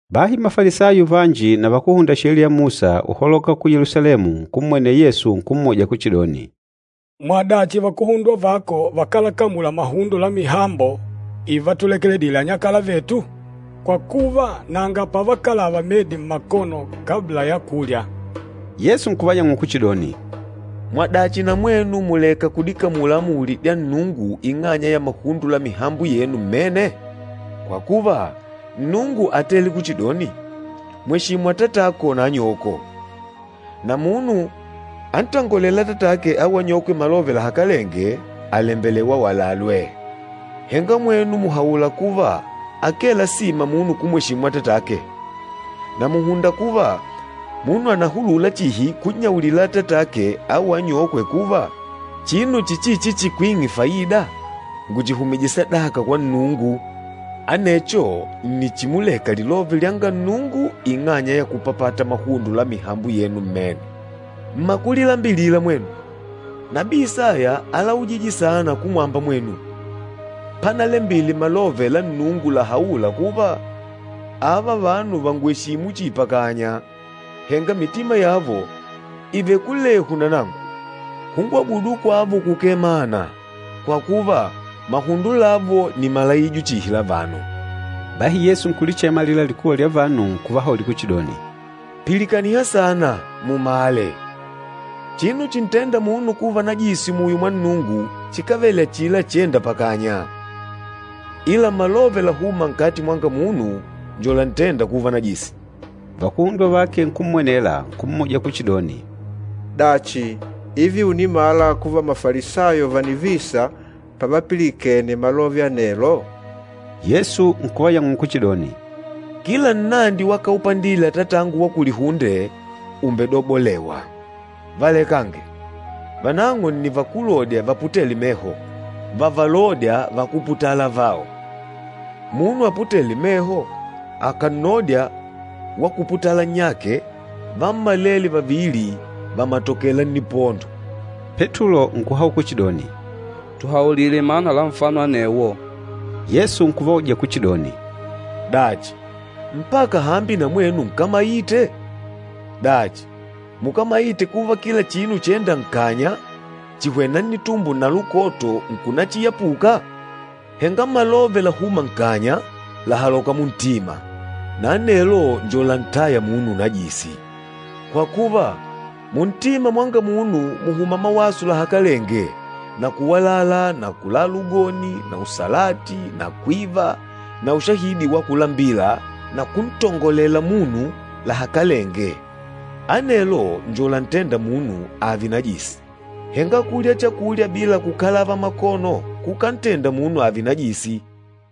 Bahi Mafalisayo vanji na vakúhunda Sheliya ya Musa uholoka ku Yelusalemu, nkummwenela Yesu nkummuja kuchidoni, “Mwadachi vakuhundwa vako vakálakamula mahundo la mihambo ivatulekedile anyakala vetu? Kwa kuva, nanga pavakalava medi mmakono kabla ya kulya!” Yesu nkuvayang'ula kuchidoni, “Mwadachi na mwenu muleka kudikamula amuli dya Nnungu ing'anya ya mahundo la mihambo yenu mmene? Kwa kuva, Nnungu átele kuchidoni, ‘Mweshimu atatako na anyoko,’ na ‘Munu antongolêla atatake au anyokwe malove lahakalenge àlembelewa awalalwe’. Henga mwenu mùhaula kuva akee lasima munu kumweshimu atatake, na mùhunda kuva munu ànahulula chihi kunnyaulila atatake au anyokwe kuva ‘Chinu chichichi chikwing'e faida, ngùchihumije sadaka kwa Nnungu.’ Anecho nni chimuleka lilove lyanga Nnungu ing'anya ya kupapata mahundo la mihambo yenu mmene. Mmakulilambilila mwenu! Nabii Isaya álaujije saana kumwamba mwenu, panalembile malove la Nnungu lahaûla kuva, ‘Ava vanu vàngweshimu chihi pakanya, henga mitima yavo ìvele kulehu na nangu. Kungwabudu kwavo kukee mana, kwa kuva, mahundo lavo nni malaijo chihi la vanu.’” Bahi Yesu nkulichema alila likuwa lya vanu nkuvahaulila kuchidoni, “Pilikaniha saana, mumale! Chinu chintênda munu kuva najisi muyo mwa Nnungu chikávele achila chênda pakanya, ila malove làhuma nkati mwanga munu njo lantênda kuva najisi.” Vakuhundwa vake nkummwenela, nkummuja kuchidoni, “Dachi, ivi unimala kuva Mafalisayo vànivisa pavapilikene malove anelo?” Yesu nkuvayang'ula kuchidoni, “Kila nnandi wakaupandile Atatangu wa kulihunde, umbedobolewa. Valekange! Vanang'o nni vakúlodya vaputêle meho, vavalôdya vakúputala avao. Munu aputêle meho akànnodya wakuputala nnyake, vammalele vavili vàmatokela nnipondo.” Petulo nkuhaula kuchidoni, “Tuhaulile mana la nfano anewo.” Yesu nkuvauja kuchidoni, “Dachi, mpaka hambi na mwenu nkámaite? Dachi, mukámaite kuva kila chinu chênda nkanya, chìhwena nnitumbo na lukoto nkunachiyapuka? Henga malove lahûma nkanya, làhaloka muntima, na anelo njo lantâya munu unajisi. Kwa kuva, muntima mwanga munu mùhuma mawaso lahakalenge na kuwalala na kulala ugoni na usalati na kwiva na ushahidi wa kulambila na kuntongolela munu lahakalenge. Anelo njo lantênda munu ààve najisi. Henga kulya chakulya bila kukalava makono kukántenda munu ààve najisi.”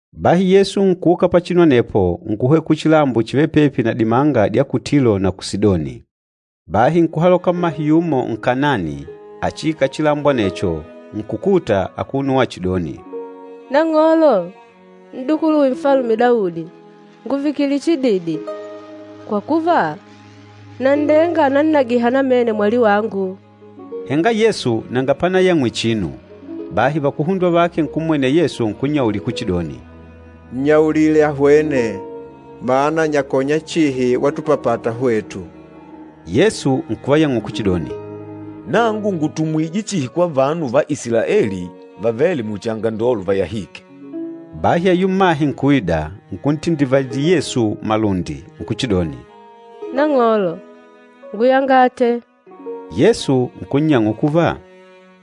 Bahi Yesu nkuuka pachinu anepo, nkuhwena kuchilambo chivêle pepi na dimanga dya ku Tilo na ku Sidoni. Bahi nkuhaloka mmahe yumo Nkanaani achiikala chilambo anecho, nkukuta, akuno wachidoni, “Nang'olo, N'dukuluwe Nfalume Daudi, ngùvikile chididi! Kwa kuva, nanndenga ànannagiha namene mwali wangu.” Henga Yesu nanga panayangw'ile chinu. Bahi vakuhundwa vake nkummwenela Yesu nkunnyaulila kuchidoni, “Nnyaulile ahwene, mana anyakonya chihi watupapata hwetu.” Yesu nkuvayang'ula kuchidoni, “Nangu ngùtumwije chihi kwa vanu va Isilaeli vavêle muchi angandolo vayahîke.” Bahi ayula mmahe nkuida, nkuntindivalila Yesu malundi, nkuchidoni, “Nang'olo, nguyangate.” Yesu nkunnyang'ula kuva,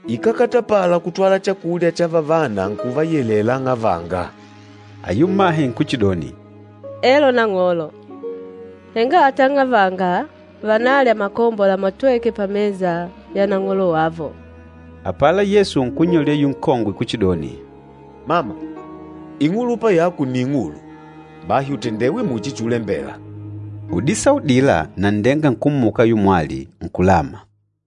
“Ikákatapala kutwala chakulya cha vavana nkuvayelela ang'avanga.” Ayula mmahe nkuchidoni, “Elo Nang'olo, henga ata ang'avanga vànalya makombo lamatwêke pamesa ya nang'olo wavo.” Apala Yesu nkunnyaulila ayula nkongwe kuchidoni, “Mama, ing'ulupa yako nni ing'ulu! Bahi utendewe muchi chulembela.” Udisaa udila nanndenga nkummuka ayula mwali, nkulama.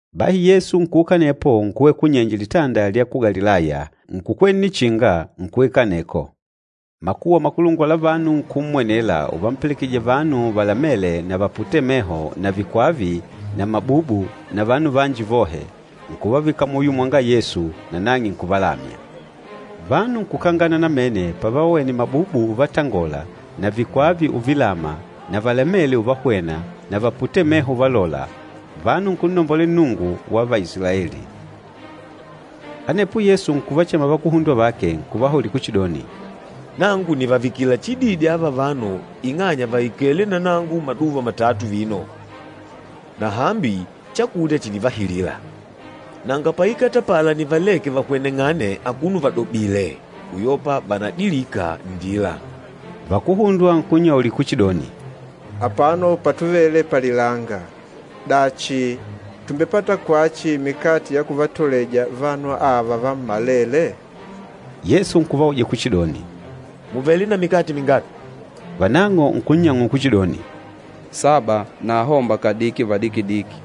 Bahi Yesu nkuuka anepo nkuhwena kunyenje Litanda lya ku Galilaya, nkukwela nnichinga, nkuikala aneko. Makuwa makulungwa la vanu nkummwenela uvampelekejija vanu valamêle na vaputêle meho na vikwava na mabubu na vanu vanji vohe, nkuvavika muyo mwanga Yesu, nanang'e nkuvalamya. Vanu nkukangana namene pavavonite mabubu uvatangola na vikwava uvalama na valamele uvahwena na vaputêle meho uvalola, vanu nkunnombolela Nnungu wa Vaisilaeli. Anepo Yesu nkuvachema vakuhundwa vake, nkuvahaulila kuchidoni, “Nangu nìvavikila chididi ava vanu ing'anya vàikele na nangu maduva matatu vino, na hambi chakulya chìnivahilila. Nanga paikatapala nivaleke vahweneng'ane akuno vadobìlè, uyopa vanadilika nndila.” Vakuhundwa nkunnyaulila kuchidoni, “Apano patuvele palilanga. Dachi, tùmbepata kwachi mikate ya kuvatoleja vanu ava vammalele?” Yesu nkuvauja kuchidoni, “Mùvele na mikate mingapi?” Vanang'o nkunnyang'ula kuchidoni, “Saba na ahomba kadiki vadikidiki.”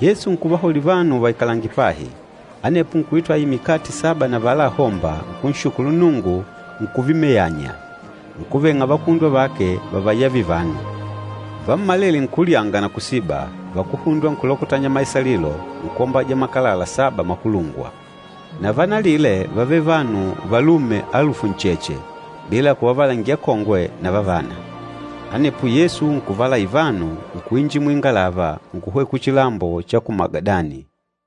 Yesu nkuvahaulila vanu vaikalange pahi. Anepo nkuitwala aila mikate saba na avala ahomba, nkunshukulu Nnungu, nkuvimeyanya, nkuveng'a vakuhundwa vake vavayavile vanu. Vammalele nkulyanga na kusiba, vakuhundwa nkulokotanya maisalilo, nkwombaja makalala saba vikulungwa. Na vanalile vávele vanu valume alufu ncheche, bila kuvavalangila akongwe na vavana. Anepo Yesu nkuvalaila vanu, nkuinjila muingalava, nkuhwena kuchilambo cha ku Magadani.